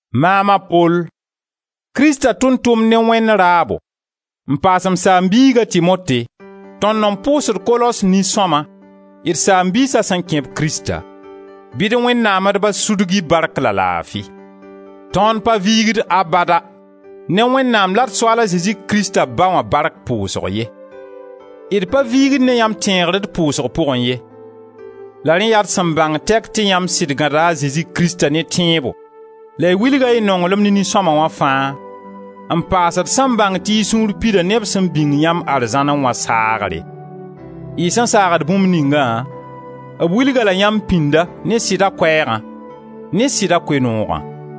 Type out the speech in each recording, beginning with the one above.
Maam a Pol, Krista tʋʋm-tʋmd ne Wẽnd raabo, n paas m saam-biig a Timote tõnd n pʋʋsd Kolos nin-sõma, d saam-biisa sẽn kẽ-b Krista. Bɩ d Wẽnnaam d Ba sudg-y bark la laafi! Tõnd pa viigd abada ne Wẽnnaam la d Soaal a Zezi Krista Ba wã bark pʋʋsg ye. D pa viigd ne yãmb tẽegr d pʋʋsg pʋgẽ ye. La rẽ yaa d sẽn bãng tɛk tɩ yãmb sɩd gãda a Zezi Krista ne tẽebo la y wilga y nonglem ne nin-sõma wã fãa, n paas d sẽn bãng tɩ y sũur pida ne b sẽn bĩng yãmb arzãnẽ wã saagre. Y sẽn saagd bũmb ningã, b wilg-a-la yãmb pĩnda ne Sɩda Koɛɛgã, ne Sɩda Koe-noogã.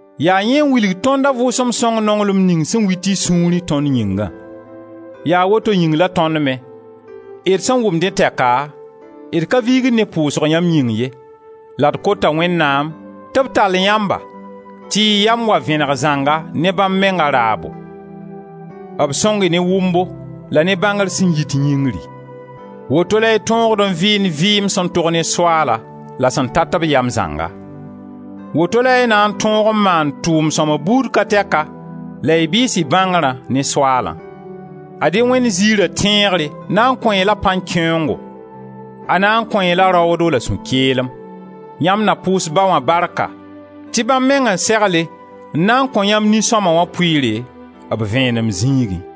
Yaa yẽ n wilg tõnd a Vʋʋsem Sõng nonglem ning sẽn wit y sũurẽ tõnd yĩngã. Yaa woto yĩng la tõnd me, d sẽn wʋm dẽ tɛka, d ka viigd ne pʋʋsg yãmb yĩng ye, la d kota Wẽnnaam tɩ b tall yãmba tɩ y yam wa vẽneg zãnga ne bãmb menga raabo; b sõng-y ne wʋmbo la ne bãngr sẽn yit yĩngri. Woto la y tõogd n vɩɩnd vɩɩm sẽn tog ne Soaala la sẽn tat b yam zãnga; woto la y na n tõog n maan tʋʋm sõma buud ka tɛka la y bɩɩs y bãngrã ne Soaalã. Ad-y Wẽnd ziira tẽegre na n kõ-y la pan-kẽengo, a na n kõ-y-la raoodo la sũ-keelem. Yãmb na pʋʋs Ba wã barka tɩ bãmb meng n segle n na kõ yãmb nin-sõma wã pʋɩɩre, b vẽenem zĩigẽ.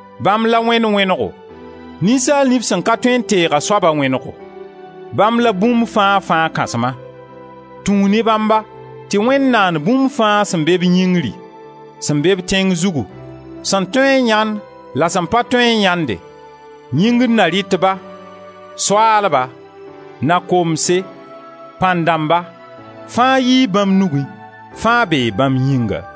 Bãmb la Wẽnd wẽnego, ninsaal nif sẽn ka tõe n teeg a soaba wẽnego. Bãmb la bũmb fãa-fãa Kãsma. Tũu ne bãmba tɩ Wẽnd naan bũmb fãa sẽn be-b yĩngri, sẽn be-b tẽng zugu, sẽn toe n yãend la sẽn pa tõe n yãende yĩngr Na-rɩtba, Soaalba, Na-komse, Pãn-dãmba, fãa yii bãmb nugẽ, fãa bee bãmb yĩnga.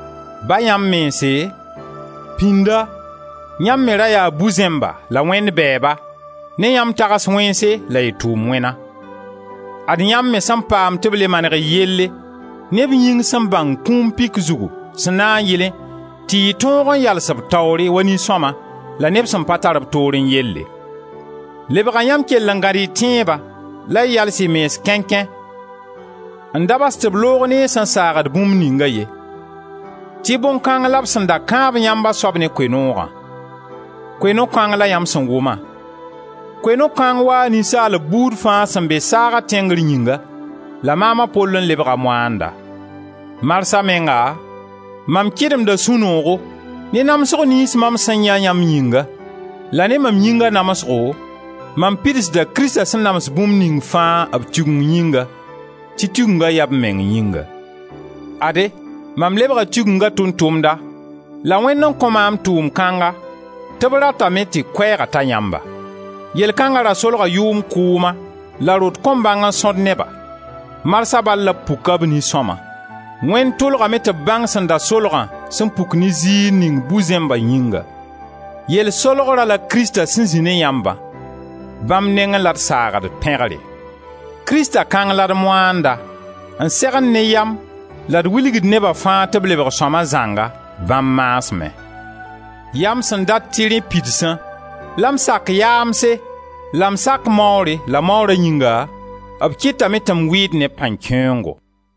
Ba yãmb mense, pĩnda yãmb me ra yaa bu-zẽmba la Wẽnd bɛɛba, ne yãmb tags wẽnse la y tʋʋm wẽna; ad yãmb me sẽn paam tɩ b le maneg y yelle ne b yĩng sẽn bãng kũum pik zugu, sẽn na n yɩlẽ tɩ y tõog n yals b taoore wa nin-sõma la neb sẽn pa tar b toorẽ yelle. Lebga yãmb kell n gãd y tẽeba la y yals y mens kẽnkẽ n da bas tɩ b loog ne y sẽn saagd bũmb ninga ye, tɩ bõn kãng la b sẽn kãab yãmb a soab ne Koe-noogã. Koe-noog kãng la yãmb sẽn wʋma; Koe-noog kãng waa ninsaalb buud fãa sẽn be saaga tẽngr yĩnga, la maam a Pol n lebga moaanda. Marsã menga mam kɩdemda sũ-noogo ne namsg niyns mam sẽn yãe yãmb yĩnga, la ne mam yĩnga namsgo mam pidsda Krista sẽn nams bũmb ning fãa b Tigeng yĩnga, tɩ Tigenga yaa b meng yĩnga. Ade, mam lebga Tigenga tʋʋm-tʋmda la Wẽnd n kõ maam tʋʋm kãnga tɩ b ratame tɩ Koɛɛga ta yãmba. Yell kãnga ra solga yʋʋm kʋʋma la rot kõn-bãng-n-sõd neba; marsã bal la b puk-a b nin-sõma. Wẽnd tʋlgame tɩ b bãng sẽn da solgã sẽn puk ne ziir ning bu-zẽmba yĩnga. Yell solgra la Krista sẽn zĩ ne yãmbã; bãmb nengẽ la d saagd pẽgre. Krista kãng la d moanda n segend ne yam la d wilgd neba fãa tɩ b lebg sõma zãnga bãmb maasmẽ. Yaa m sẽn dat tɩ rẽ pidsã, la m sak yaamse la m sak maoore la maoora yĩnga, b kɩtame tɩ m wɩɩd ne pãn-kẽengo.